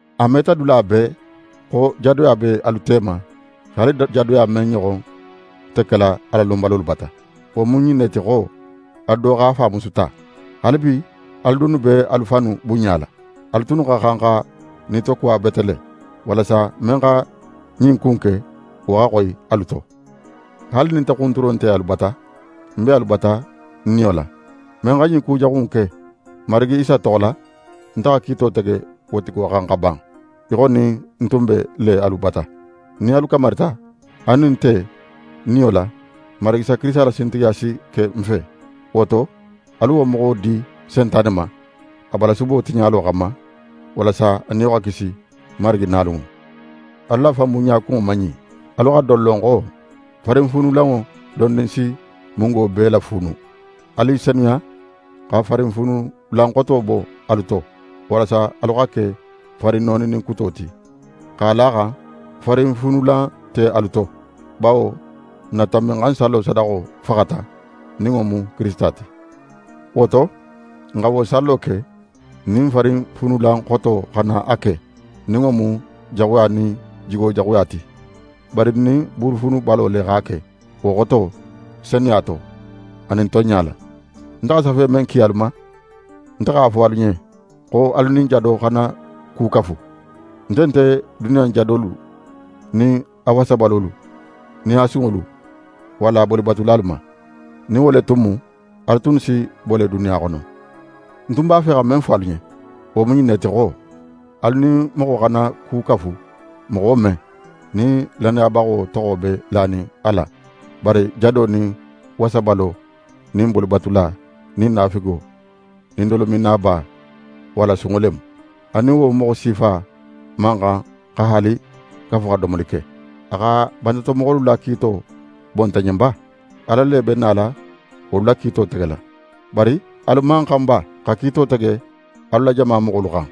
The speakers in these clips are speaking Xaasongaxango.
A meta dula bee xo jadoya be alu tema, haali jadoya men ɲoxon nte kela Alalonbalolu bata. Wo mu ɲin ne ti xo: Alu do x'a fa musu ta. Haalibi, alu dunnu be alu fannu bunɲala! Alu tunnu xa xan xa nitokuwa bete le, walasa men xa ɲin ku in ke, wo xa xoyi alu to. Haali nin nte xunturo nte alu bata, ń be alu bata ń niyo la. Men xa ɲin kujaxu in ke, n Marigi Isa toxo la, nte xa kiito tege wo tigo xan xa ban, í xo nin ń tun be le alu bata. Nin alu kamarita, alu nin nte, niyo la, n Marigi Isa la sintigiya si ke n fe. Wo to, alu wo moxo di Sentane ma, a balasubo tiɲalo xanma, walasa a niyo xa kisi Marigi nalunŋo. Alu la fanbunɲa kunŋo man ɲin. Alu xa don lon xo: «Farinfuunulanŋo dondin si mungo bee lafuunu.» Alu i senuya, xa farinfuunulan xoto bo alu to, walasa alu xa ke farin nooninin kuto ti, x'a la a xan farinfuunulan nte alu to. Bawo n na Tanbinxansallo sadaxo faxata, nin wo mu Kirisita ti. Wo to, n xa wo sallo ke, n nin farinfuunulan xoto xana a ke, nin wo mu jaxuya nin jigojaxuya ti, bari n nin buuru fuunubalo le x'a ke, wo xoto: Senuya to, anin tonɲa la. Nte xa safe men ki alu ma, nte x'a fo alu ɲen xo alu nin jado xana ku kafu. Nte nte ɲin duniya in jadolu nin a wasabalolu nin a sunŋolu walla a bolibatulalu ma. Nin wo le tun mu, alu tunnu si bo le duniya xono. Ń tun b'a fe xa men fo alu ɲen, wo mu ɲin ne ti xo: Alu nin moxo xana ku kafu moxo men, nin lannayabaxo toxo be lanin a la, bari jado nin wasabalo, nin bolibatula, nin naafigo, nin dolominnaba, walla sunŋo le mu. Alu nin wo moxo sifa man xan xa haali kafu xa domoli ke. A xa bantatomoxolu la kiito bo nte ɲen ba? Ala le be nala wolu la kiito tegela. Bari alu man xan ba xa kiito tege alu la jama moxolu xan?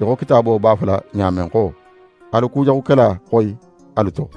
Í xo Kitaabo b'a fola ɲa men xo: «Alu kujaxukela xoyi alu to.»